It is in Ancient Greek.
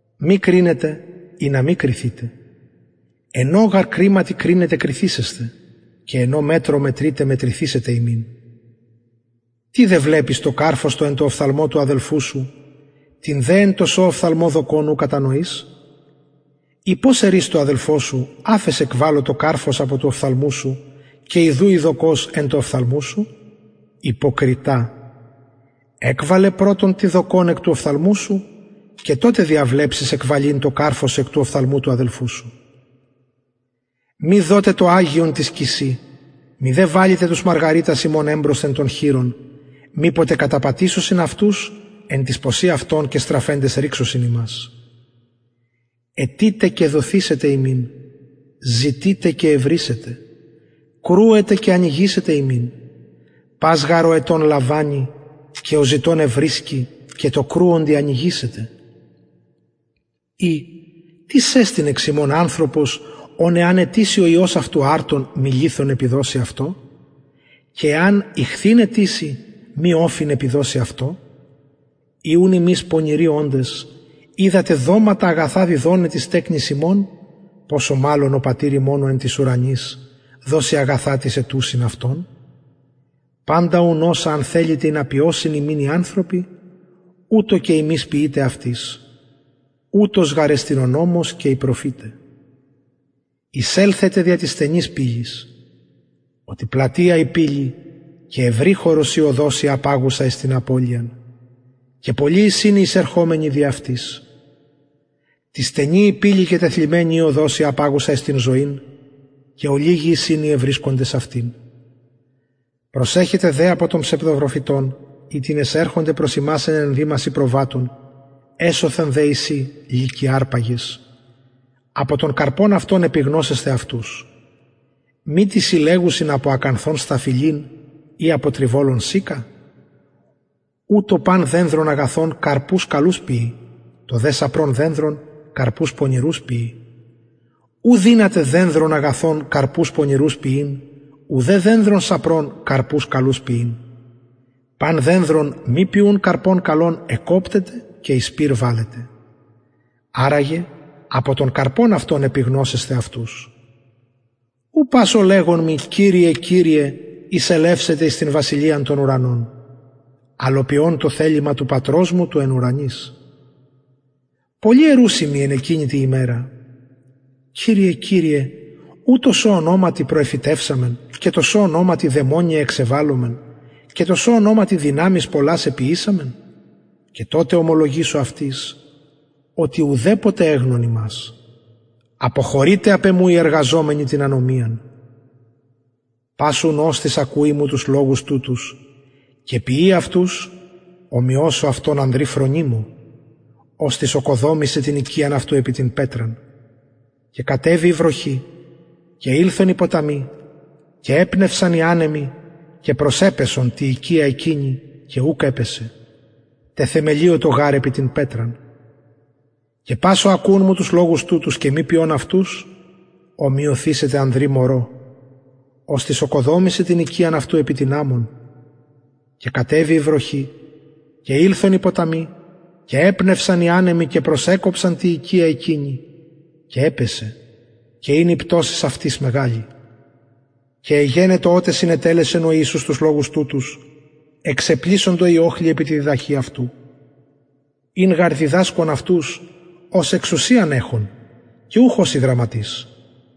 μη κρινετε ινα μη κριθητε εν ω γαρ κριματι κρινετε κριθησεσθε και εν ω μετρω μετρειτε μετρηθησεται υμιν τι δε βλεπεις το καρφος το εν τω οφθαλμω του αδελφου σου την δε εν τω σω οφθαλμω δοκον ου κατανοεις η πως ερεις τω αδελφω σου αφες εκβαλω το καρφος απο του οφθαλμου σου και ιδου η δοκος εν τω οφθαλμω σου υποκριτα εκβαλε πρωτον την δοκον εκ του οφθαλμου σου και τοτε διαβλεψεις εκβαλειν το καρφος εκ του οφθαλμου του αδελφου σου μη δωτε το αγιον τοις κυσιν μηδε βαλητε τους μαργαριτας υμων εμπροσθεν των χοιρων μηποτε καταπατησωσιν αυτους εν τοις ποσιν αυτων και στραφεντες ρηξωσιν υμας αιτειτε και δοθησεται υμιν ζητειτε και ευρησετε κρουετε και ανοιγησεται υμιν πας γαρ ο αιτων λαμβανει και ο ζητων ευρισκει και τω κρουοντι ανοιγησεται η τις εστιν εξ υμων ανθρωπος ον εαν αιτηση ο υιος αυτου αρτον μη λιθον επιδωσει αυτω και εαν ιχθυν αιτηση μη οφιν επιδωσει αυτω ει ουν υμεις πονηροι οντες οιδατε δοματα αγαθα διδοναι τοις τεκνοις υμων ποσω μαλλον ο πατηρ υμων ο εν τοις ουρανοις δωσει αγαθα τοις αιτουσιν αυτον παντα ουν οσα αν θελητε ινα ποιωσιν υμιν οι ανθρωποι ουτως και υμεις ποιειτε αυτοις ουτος γαρ εστιν ο νομος και οι προφηται εισελθετε δια της στενης πυλης οτι πλατεια η πυλη και ευρυχωρος η οδος η απαγουσα εις την απωλειαν και πολλοι εισιν οι εισερχομενοι δι αυτης τι στενη η πυλη και τεθλιμμενη η οδος η απαγουσα εις την ζωην και ολιγοι εισιν οι ευρισκοντες αυτην προσεχετε δε απο των ψευδοπροφητων οιτινες ερχονται προς υμας εν ενδυμασιν προβατων εσωθεν δε εισιν λυκοι αρπαγες απο των καρπων αυτων επιγνωσεσθε αυτους μητι συλλεγουσιν απο ακανθων σταφυλην η απο τριβολων συκα ουτως παν δενδρον αγαθον καρπους καλους ποιει το δε σαπρον δενδρον καρπους πονηρους ποιει ου δυναται δενδρον αγαθον καρπους πονηρους ποιειν ουδε δενδρον σαπρον καρπους καλους ποιειν παν δενδρον μη ποιουν καρπον καλον εκκοπτεται και εις πυρ βαλλεται αρα γε απο των καρπων αυτων επιγνωσεσθε αυτους ου πας ο λεγων μοι κυριε κυριε εισελευσεται εις την βασιλειαν των ουρανων αλλ ο ποιων το θελημα του πατρος μου του εν ουρανοις πολλοι ερουσιν μοι εν εκεινη τη ημερα κυριε κυριε ου τω σω ονοματι προεφητευσαμεν και τω σω ονοματι δαιμονια εξεβαλομεν και τω σω ονοματι δυναμεις πολλας εποιησαμεν και τοτε ομολογησω αυτοις οτι ουδεποτε εγνων υμας αποχωρειτε απ εμου οι εργαζομενοι την ανομιαν πας ουν οστις ακουει μου τους λογους τουτους και ποιει αυτους ομοιωσω αυτον ανδρι φρονιμω οστις ωκοδομησεν την οικιαν αυτου επι την πετραν και κατεβη η βροχη και ηλθον οι ποταμοι και επνευσαν οι ανεμοι και προσεπεσον τη οικια εκεινη και ουκ επεσεν τεθεμελιωτο γαρ επι την πετραν και πας ο ακουων μου τους λογους τουτους και μη ποιων αυτους ομοιωθησεται ανδρι μωρω οστις ωκοδομησεν την οικιαν αυτου επι την αμμον και κατεβη η βροχη και ηλθον οι ποταμοι και επνευσαν οι ανεμοι και προσεκοψαν τη οικια εκεινη και επεσεν και ην η πτωσις αυτης μεγαλη και εγενετο οτε συνετελεσεν ο ιησους τους λογους τουτους εξεπλησσοντο οι οχλοι επι τη διδαχη αυτου ην γαρ διδασκων αυτους ως εξουσιαν εχων και ουχ ως οι γραμματεις